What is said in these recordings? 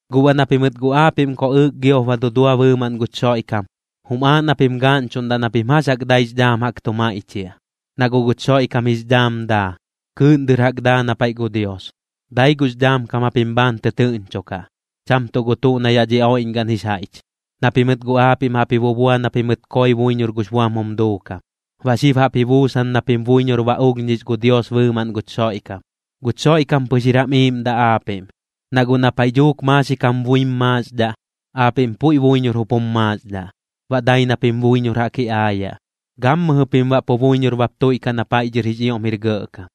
Guꞌ baꞌ na pimɨt guꞌ aapiꞌm koꞌɨɨk giop ba dudua bɨɨmaꞌn guch Xoiꞌkam, jum aaꞌ na pim gaaꞌñchuꞌndaꞌ na pim jax jaꞌk daix dhaam jaꞌk tu maiꞌchiaꞌ, na guꞌ guch Xoiꞌkam jix dhaam daa, kɨɨꞌn dɨr jaꞌk daa na paiꞌ gu Dios. Dai gux dhaam kam japim bhaan tɨtɨɨꞌñchokaꞌ, cham tuꞌ gu tuꞌ na yaꞌ dhi oiꞌñgaꞌn jix jaiꞌch. Na pimɨt guꞌ aapiꞌm jaꞌp ji bubua na pimɨt koi buiñor gux buam jum duukam, baꞌ xib jaꞌp ji buusan na pim buiñor ba ulhñix gu Dios bɨɨmaꞌn guch Xoiꞌkam. Guch Xoiꞌkam pɨx jir jam iiꞌmdaꞌ aapiꞌm, na guꞌ na paiꞌ dhuuk maaxik jam buim maaxdhaꞌ, aapiꞌm puiꞌ buiñor jup jum maaxdhaꞌ, baꞌ dai na pim buiñor jaꞌk ji aayaꞌ, gammɨjɨ pim baꞌ pu buiñor bap tuiꞌkaꞌ na paiꞌ dhɨr jix ioꞌm jir gɇꞌkam.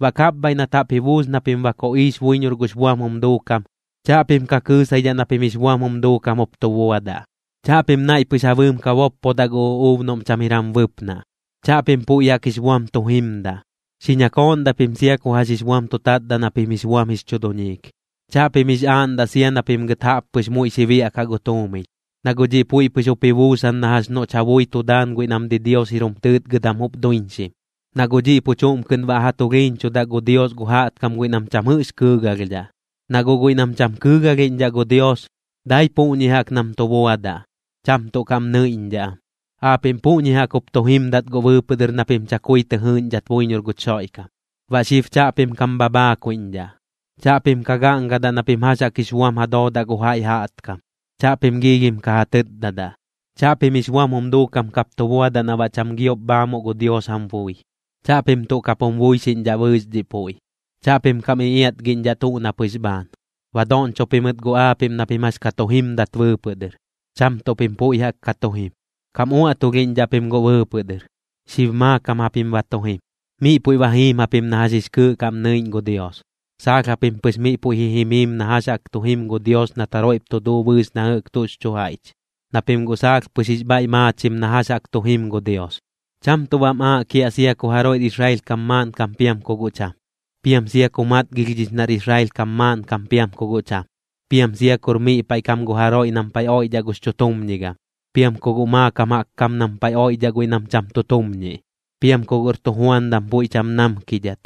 Baꞌ kapbhaiꞌ nat jaꞌp ji buus na pim ba koꞌiix buiñor gux buam jum duukam, chaꞌpim ka kɨɨsaidhaꞌ na pim jix buam jum duukam jup tu buadaꞌ. Chaꞌpim naiꞌ pɨx ja bɨɨm ka boppodaꞌ gu uꞌuub noꞌm cham jir jam bɨpnaꞌ. Chaꞌpim puiꞌ jaꞌk jix buam tu jimdaꞌ. Xi ñakooꞌndaꞌ pim sia ku jax jix buam tu tatdaꞌ na pim jix buam jix chu duñiik. Chaꞌpim jix aaꞌndaꞌ sia na pim gɨt jaꞌp pɨx muiꞌ xi biaꞌkaꞌ gu tuumiñ, na guꞌ dhiꞌ puiꞌ pɨx jup ji buusan na jax noꞌch ja bui tu daan guiꞌ nam didios jir jum tɨɨtgɨdam jup duiñxim. Na guꞌ dhiꞌ pu chuꞌm kɨꞌn baꞌ ja tulhiiñchudaꞌ gu Dios gu jaꞌtkam guiꞌ nam cham jɨꞌx kɨɨgalhdhaꞌ. Na guꞌ guiꞌ nam cham kɨɨgalhiꞌñdhaꞌ gu Dios, dai puꞌñi jaꞌk nam tu buadaꞌ, cham tuꞌ kaꞌm nɨiꞌñdhaꞌ am. Aapiꞌm puꞌñi jaꞌk jup tu jimdat guꞌ bɨɨpɨꞌ dɨr na pim chakui tɨ jɨɨꞌñdhat buiñor guch Xoiꞌkam. Baꞌ xib chaꞌpim kam bhabhaakuiꞌñdhaꞌ. Chaꞌpim ka gaꞌngadaꞌ na pim jax jaꞌk jix buam ja doodaꞌ gu jaiꞌ jaꞌtkam, chaꞌpim giilhim ka ja tɨtdadaꞌ. Chaꞌpim jix buam jum duukam kap tu buadaꞌ na baꞌ cham giop bhaamuꞌ gu Dios jam bui. Chaꞌpim tuꞌ kap jum buixiꞌñdhaꞌ bɨɨx dhiꞌ puiꞌ. Chaꞌpim kam iꞌiatgiꞌñdhaꞌ tuꞌ na pɨx bhaan. Ba doꞌñcho pimɨt guꞌ aapiꞌm na pim jax ka tu jimdat bɨɨpɨꞌ dɨr, cham tuꞌ pim puiꞌ jaꞌk ka tu jim. Kam uaꞌtulhiꞌñdhaꞌ pim guꞌ bɨɨpɨꞌ dɨr, xib maakam japim ba tu jim, miꞌ puiꞌ ba jiim japim na jax jix kɨɨꞌ kaꞌm nɨiꞌñ gu Dios. Saalh japim pɨx miꞌ puiꞌ ji jimiim na jax jaꞌk tu jim gu Dios nat jaroiꞌp tu duu bɨɨx na jɨꞌk tuꞌx chu jaiꞌch, na pim guꞌ saalh pɨx jix bhaiꞌ maachim na jax jaꞌk tu jim gu Dios. Cham tuꞌ baꞌm aaꞌ kiaꞌ sia ku jaroiꞌr Israel kam maaꞌnkam piam ku guꞌ cham. Piam sia ku matgilhdhix nar Israel kam maaꞌnkam piam ku guꞌ cham. Piam sia kur miꞌ paiꞌ kam gu jaroiꞌ nam paiꞌ oiꞌdhaꞌ gux chutumñigam, piam ku guꞌ maakam jaꞌk kam nam paiꞌ oiꞌdhaꞌ guiꞌ nam cham tu tumñiꞌ. Piam ku guꞌr tujuandam puiꞌ cham namkidhat,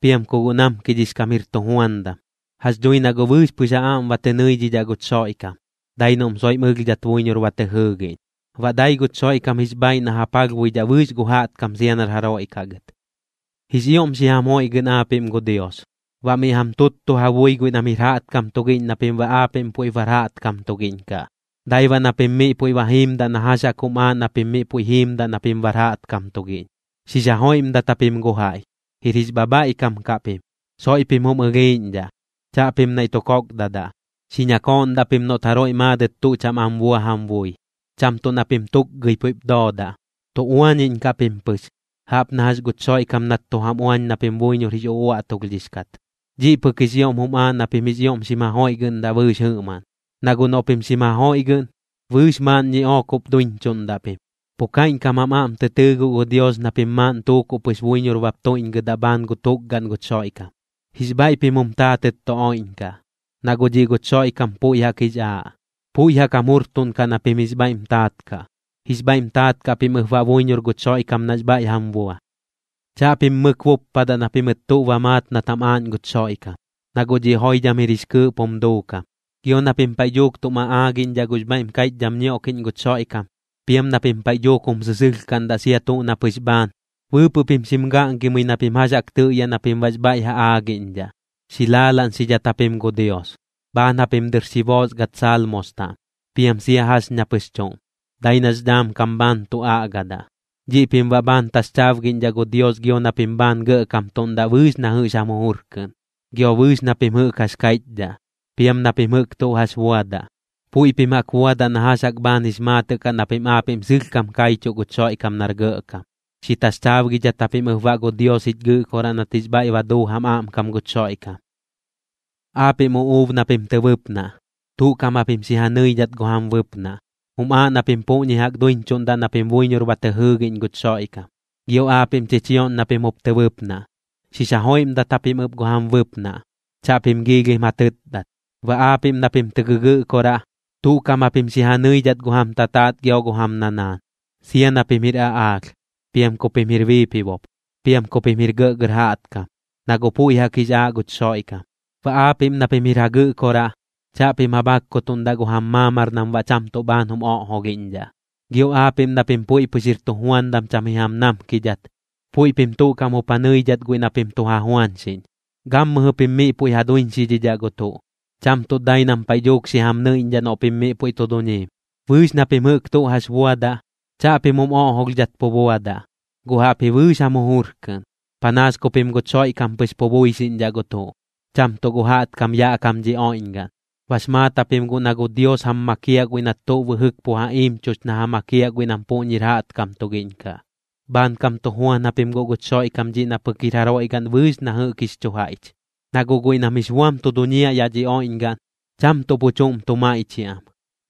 piam ku guꞌ namkidhix kam jir tujuandam. Jax dhui na guꞌ bɨɨx pɨx ja aꞌm ba tɨ nɨidhidhaꞌ guch Xoiꞌkam, dai noꞌm soiꞌm ɨlhdhat buiñor ba tɨ jɨɨgiꞌñ. Baꞌ dai guch Xoiꞌkam jix bhaaiꞌ na ja palhbuidhaꞌ bɨɨx gu jaꞌtkam sia nar jaroiꞌ kaꞌ gɨt. Jix ioꞌm xi jam joiꞌgɨꞌn aapiꞌm gu Dios, baꞌ miꞌ jam tuttu ja bui guiꞌ nam jir jaꞌtkam tugiꞌñ na pim baꞌ aapiꞌm puiꞌp bar jaꞌtkam tugiꞌñ kaꞌ. Dai baꞌ na pim miꞌ puiꞌ ba jiimdaꞌ na jax jaꞌk jum aaꞌ na pim miꞌ puiꞌ jiimdaꞌ na pim bar jaꞌtkam tugiꞌñ. Xix jajoiꞌmdat japim gu jaiꞌ, jir jix bhabhaiꞌkam kaꞌ pim. Soiꞌ pim jum ɨlhiiꞌñdhaꞌ, chaꞌpim naiꞌ tu kokdadaꞌ. Xi ñakooꞌndaꞌ pim noꞌt jaroiꞌ maadɨt tuꞌ cham am bua jam bui, cham tuꞌ na pim tukgɨi puiꞌp doodaꞌ. Tu uañiꞌñkaꞌ pim pɨx, jaꞌp na jax guch Xoiꞌkam nat tu jam uañ na pim buiñor jix uꞌuaꞌtulhdhix kat. Dhiꞌ pɨk jix ioꞌm jum aaꞌ na pim jix ioꞌm xim jajoiꞌgɨꞌndaꞌ bɨɨx jɨꞌmaꞌn, na guꞌ noꞌ pim xim jajoiꞌgɨꞌn, bɨɨx maaꞌn ñiꞌook jup duiñchuꞌndaꞌ pim. Pu kaiꞌñkam jam aꞌm tɨ tɨɨ guꞌ gu Dios na pim maaꞌn tuukuꞌ pɨx buiñor bap tuiꞌñgɨdaꞌ bhaan gu tukgaꞌn guch Xoiꞌkam. Jix bhaiꞌ pim jum taatɨt tu oiꞌñkaꞌ, na guꞌ dhiꞌ guch Xoiꞌkam puiꞌ jaꞌk jix aaꞌ, puiꞌ jaꞌk jam jujurtuꞌnkaꞌ na pim jix bhaiꞌm taat kaꞌ. Jix bhaiꞌm taat kaꞌ pim ɨp baꞌ buiñor guch Xoiꞌkam nax bhaiꞌ jam bua. Chaꞌpim mɨk buppadaꞌ na pimɨt tuꞌ ba maat nat jam aaꞌñ guch Xoiꞌkam, na guꞌ dhiꞌ joidham jir jix kɨɨꞌp jum duukam. Gio na pim paiꞌ dhuuk tum aꞌaagiꞌñdhaꞌ gux bhaiꞌm kaiꞌchdham ñioꞌkiꞌñ guch Xoiꞌkam, piam na pim paiꞌ dhuuk jum sɨsɨlhkaꞌndaꞌ sia tuꞌ na pɨx bhaan, bɨɨpɨꞌ pim xim gaꞌngimɨi na pim jax jaꞌk tɨꞌyaꞌ na pim baꞌx bhaiꞌ ja aagiꞌñdhaꞌ. Xi laalaꞌñxidhat japim gu Dios, bhaan japim dɨr xi boosgat Saalmos taꞌm, piam sia jax ña pɨx chuꞌm, dai nax dhaam kam bhaan tu aꞌgadaꞌ. Dhiꞌ pim baꞌ bhaan taxchaabgiꞌñdhaꞌ gu Dios gio na pim bhaan gɇꞌkamtuꞌndaꞌ bɨɨx na jɨꞌx jam jujur kɨꞌn. Gio bɨɨx na pim jɨꞌk jax kaiꞌchdhaꞌ, piam na pim jɨꞌk tuꞌ jax buadaꞌ, puiꞌ pim jaꞌk buadaꞌ na jax jaꞌk bhaan jix maatɨꞌ kaꞌ na pim aapiꞌm sɨlhkam kaichuꞌ guch Xoiꞌkam nar Gɇꞌkam. Xi taxchaabgidhat japim ɨp baꞌ gu Dios jich Gɨꞌkoraꞌ nat jix bhaiꞌ ba duu jam aꞌmkam guch Xoiꞌkam. Aapiꞌm uꞌuub na pim tɨ bɨpnaꞌ, tuꞌ kaꞌm japim xi ja nɨidhat gu jam bɨpnaꞌ. Jum aaꞌ na pim puꞌñi jaꞌk duiñchuꞌndaꞌ na pim buiñor ba tɨ jɨɨgiꞌñ guch Xoiꞌkam. Gio aapiꞌm chichioꞌñ na pim jup tɨ bɨpnaꞌ, xix jajoiꞌmdat japim ɨp gu jam bɨpnaꞌ, chaꞌpim giilhim ja tɨtdat. Baꞌ aapiꞌm na pim tɨ gɨgɨꞌkoraꞌ, tuꞌ kaꞌm japim xi ja nɨidhat gu jam tataat gio gu jam nanaan, sia na pim jir aꞌaalh, piam ku pim jir biipibop, piam ku pim jir gɇꞌgɇr jaꞌtkam, na guꞌ puiꞌ jaꞌk jix aaꞌ guch Xoiꞌkam. Baꞌ aapiꞌm na pim jir ja gɨꞌkoraꞌ, chaꞌpim ja bhakkutuꞌndaꞌ gu jam maamar nam baꞌ cham tuꞌ bhaan jum oꞌjolhiꞌñdhaꞌ. Gio aapiꞌm na pim puiꞌ pɨx jir tujuandam cham ji jam namkidhat, puiꞌ pim tuꞌ kaꞌm jup ja nɨidhat guiꞌ na pim tu ja juañxiꞌñ. Gammɨjɨ pim miꞌ puiꞌ ja duiñxidhidhaꞌ gu tuꞌ, cham tuꞌ dai nam paiꞌ dhuuk xi jam nɨiꞌñdhaꞌ noꞌ pim miꞌ puiꞌ tu duñiim. Bɨɨx na pim jɨꞌk tuꞌ jax buadaꞌ, chaꞌpim jum oꞌjolhdhat pu buadaꞌ, guꞌ jaꞌpji bɨɨx jam jujur kɨꞌn, panaas ku pim guch Xoiꞌkam pɨx pu buixiꞌñdhaꞌ gu tuꞌ, cham tuꞌ gu jaꞌtkam yaꞌ kam dhi oiꞌñgaꞌn. Bax maat japim guꞌ na gu Dios jam makiaꞌ guiꞌ nat tuꞌ bɨjɨk pu ja iimchux na ja makiaꞌ guiꞌ nam puꞌñir jaꞌtkam tugiꞌñ kaꞌ. Bhaankam tu juan japim guꞌ guch Xoiꞌkam dhiꞌ na pɨk jir jaroiꞌ gaꞌn bɨɨx na jɨꞌk jix chu jaiꞌch. Na guꞌ guiꞌ nam jix buam tu duñiaꞌ yaꞌ dhi oiꞌñgaꞌn, cham tuꞌ pu chuꞌm tu maiꞌchiaꞌ am,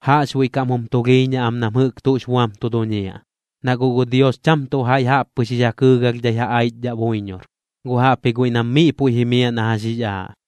jaꞌxbuiꞌ kaꞌm jum tulhiiñaꞌ am nam jɨꞌk tuꞌx buam tu duñiaꞌ, na guꞌ gu Dios cham tuꞌ jaiꞌ jaꞌp pɨx jix ja kɨɨgalhdhai ja aichdhaꞌ buiñor, guꞌ jaꞌpji guiꞌ nam miꞌ puiꞌ jimiaꞌ na jax jix aaꞌ.